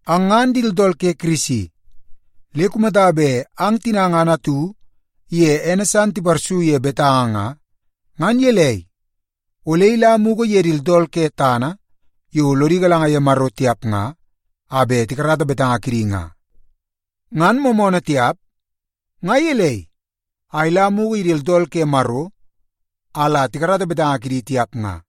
Ang ngan di tooltool ke Kirisi. Le kumata bet ang tina ngan atu iye ene san tiparsu ye betanga nga, ngan gelei, ole ila mugu ye di tooltool ke tana yo lodi galanga ye Maro tiap nga, a bet la tikarata betanga kidi? Ngan moomoonoo tiap? Nga gelei a ila mugu ye di tooltool ke Maro a la tikarata betanga kidi tiap nga?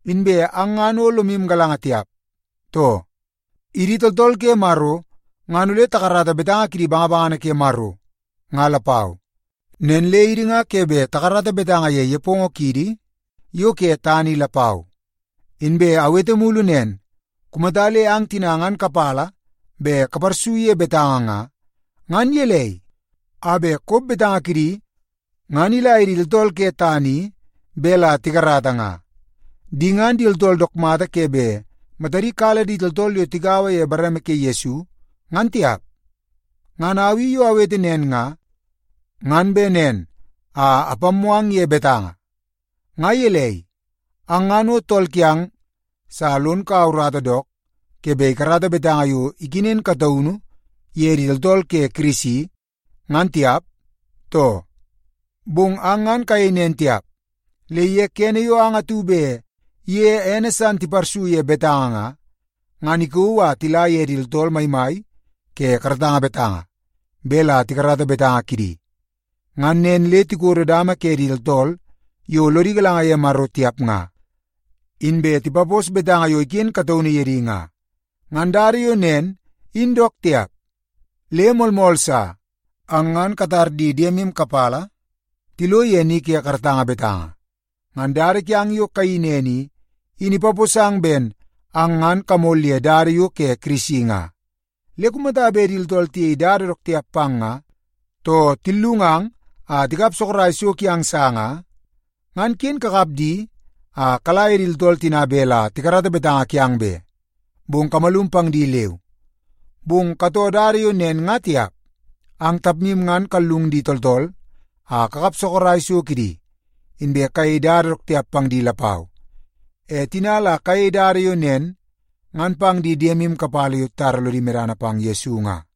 Inbe ang ngan o lomu galanga tiap, too? Idi tooltool ke Maro ngan ole takarata betanga kidi bangabangana ke Maro, nga lapau. Nen le idi nga ke bet takarata betanga ye nepongo kiidi yo ke tana i lapau. Inbe awete mulu nen, kumata le ang tina ngan kapala bet kaparsu ye betanga nga, ngan gelei a bet kop betanga kidi ngan ila ye di tooltool ke tana i bet la tikarata nga? Di ngan di tooltool dook mata ke bet matadi kala di tooltool yo tigaua ye bareme ke Yesu ngan tiap! Ngan au i yo awete nen nga, ngan bet nen a apammoo ang ye betanga. Nga gelei, ang ngan o tool kiang sa lon kaua urata dook ke bet ikarata betanga yo ikenen kataunu ye di tooltool ke Kirisi, ngan tiap, too? Bong ang ngan kayei nen tiap. Le ye kene yo ang atu bet iye ene san tiparsu ye betanga nga, ngan ikauu a tila ye di tooltool maimai ke karatanga betanga bet la tikarata betanga kidi. Ngan nen le tikodo dama ke di tooltool yo lodi galanga ye Maro tiap nga, inbe tipapos betanga yo iken kataunu ye di nga. Ngan dada yo nen in dook tiap. Le moolmool sa, ang ngan katar di diemu kapala tilo ye ni ke karatanga betanga. Ngan dada kiang yo kayeii nen i, in ipaposang ben ang ngan kamol ye dada yo ke Kirisi nga. Le kumata bet di tooltool tiyei dada dook tiap pang nga, too tillungang a tikap sorok so kiang sa nga, ngan ken kakap di a kala ye di tooltool tina bet la tikarata betanga kiang be, bong kamalum pang di leu. Bong katoo dada yo nen nga tiap. Ang tapmu ngan kallung di tooltool a kakap sorok so kidi, inbe kayei dada dook tiap pang di lapau. E tina la kayei dada yo nen ngan pang di diemu kapala yo titara lodi medana pang Yesu nga.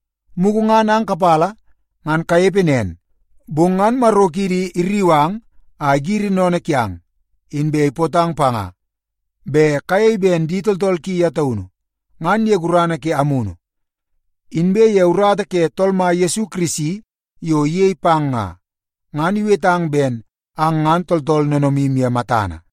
Mugu ngan ang kapala ngan kanepe nen, bong ngan Maro kiidi irriu ang a igiri sennene kiang, inbe ipootang panga bet kayei ben di tooltool ki ye taunu. Ngan ye gurana ke Amunu, inbe ye urata ke Tool Mai Yesu Kirisi yo iyei pang nga, ngan iwetang ben ang ngan tooltool noonoomu ye matana.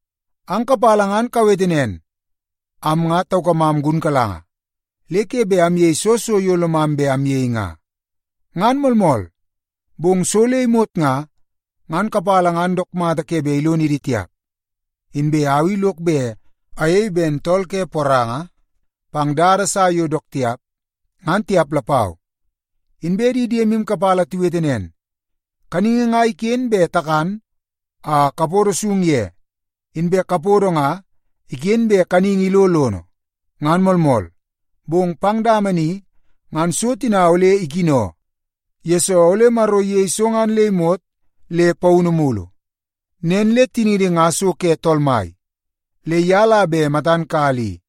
Ang kapala ngan kawete nen, “Am nga taukamam gunkalanga le ke bet amyei soo so yo lomam bet amyei nga.” Ngan moolmool, bong so le imot nga, ngan kapala ngan dook mata ke bet ilonidi tiap. Inbe au i lok bet ayei ben tool ke poranga pang dada sa yo dook tiap, ngan tiap lapau. Inbe di diemu kapala tiwete nen, “Kaningi nga iken bet takan a kapodo isung ye, inbe kapodo nga iken bet kaningi ilo lono.” Ngan moolmool, bong pang dama ni ngan so tina ole ikino, yesoo ole Maro iyei so ngan le imot le paunu mulu. Nen le tiniidi nga so ke Tool Mai, le ye la bet matan kala i.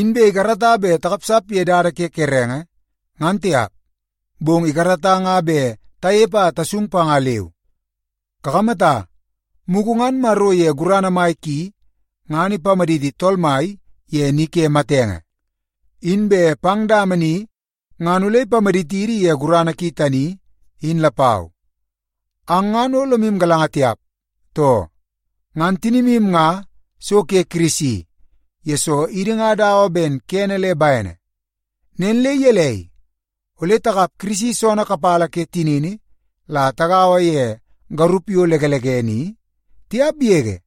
Inbe ikarata bet takapsap ye dada ke kerenge, ngan tiap, bong ikarata nga bet tanepe a tasung panga, leu. Kakamata, mugu ngan Maro ye gurana mai ki, ngan ipamaditi Tool Mai ye ni ke matenge. Inbe pang dama ni ngan ole ipamaditidi ye gurana ki tani, in lapau. Ang ngan o lomu galanga tiap, too? Ngan tinimu nga so ke Kirisi, yesoo idi nga dawa ben kene le bene. Nen le gelei, ole takap Kirisi soonoo kapala ke tinini la tagaua ye garup yo lekelekene i? Tiap yege!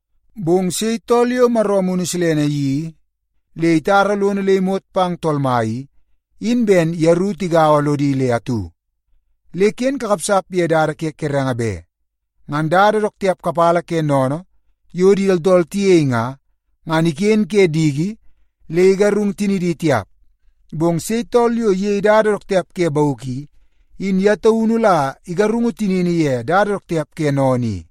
Bong sei tool yo Maro Amunu Silene iyeii le itara lono le imot pang Tool Mai i, in ben yeru tigaua lodi le atu. Le ken kakapsap ye dada ke kerenge be. Ngan dada dook tiap kapala ke sennene yo di tooltool tiyei nga, ngan iken ke diki le igarung tinidi tiap. Bong sei tool yo iyei dada dook tiap ke bauk i, in ye taunu la igarungu tinini ye dada dook tiap ke sennene i.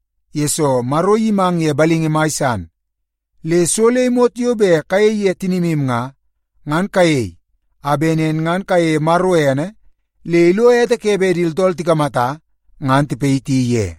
yesoo Maro iyimang ye balingi mai san. Le so le imot yo bet kayei ye tinimu nga, ngan kayei a bet nen ngan kayeie Maro ene le ilo ete ke bet di tooltool tikamata ngan tipayiti ye.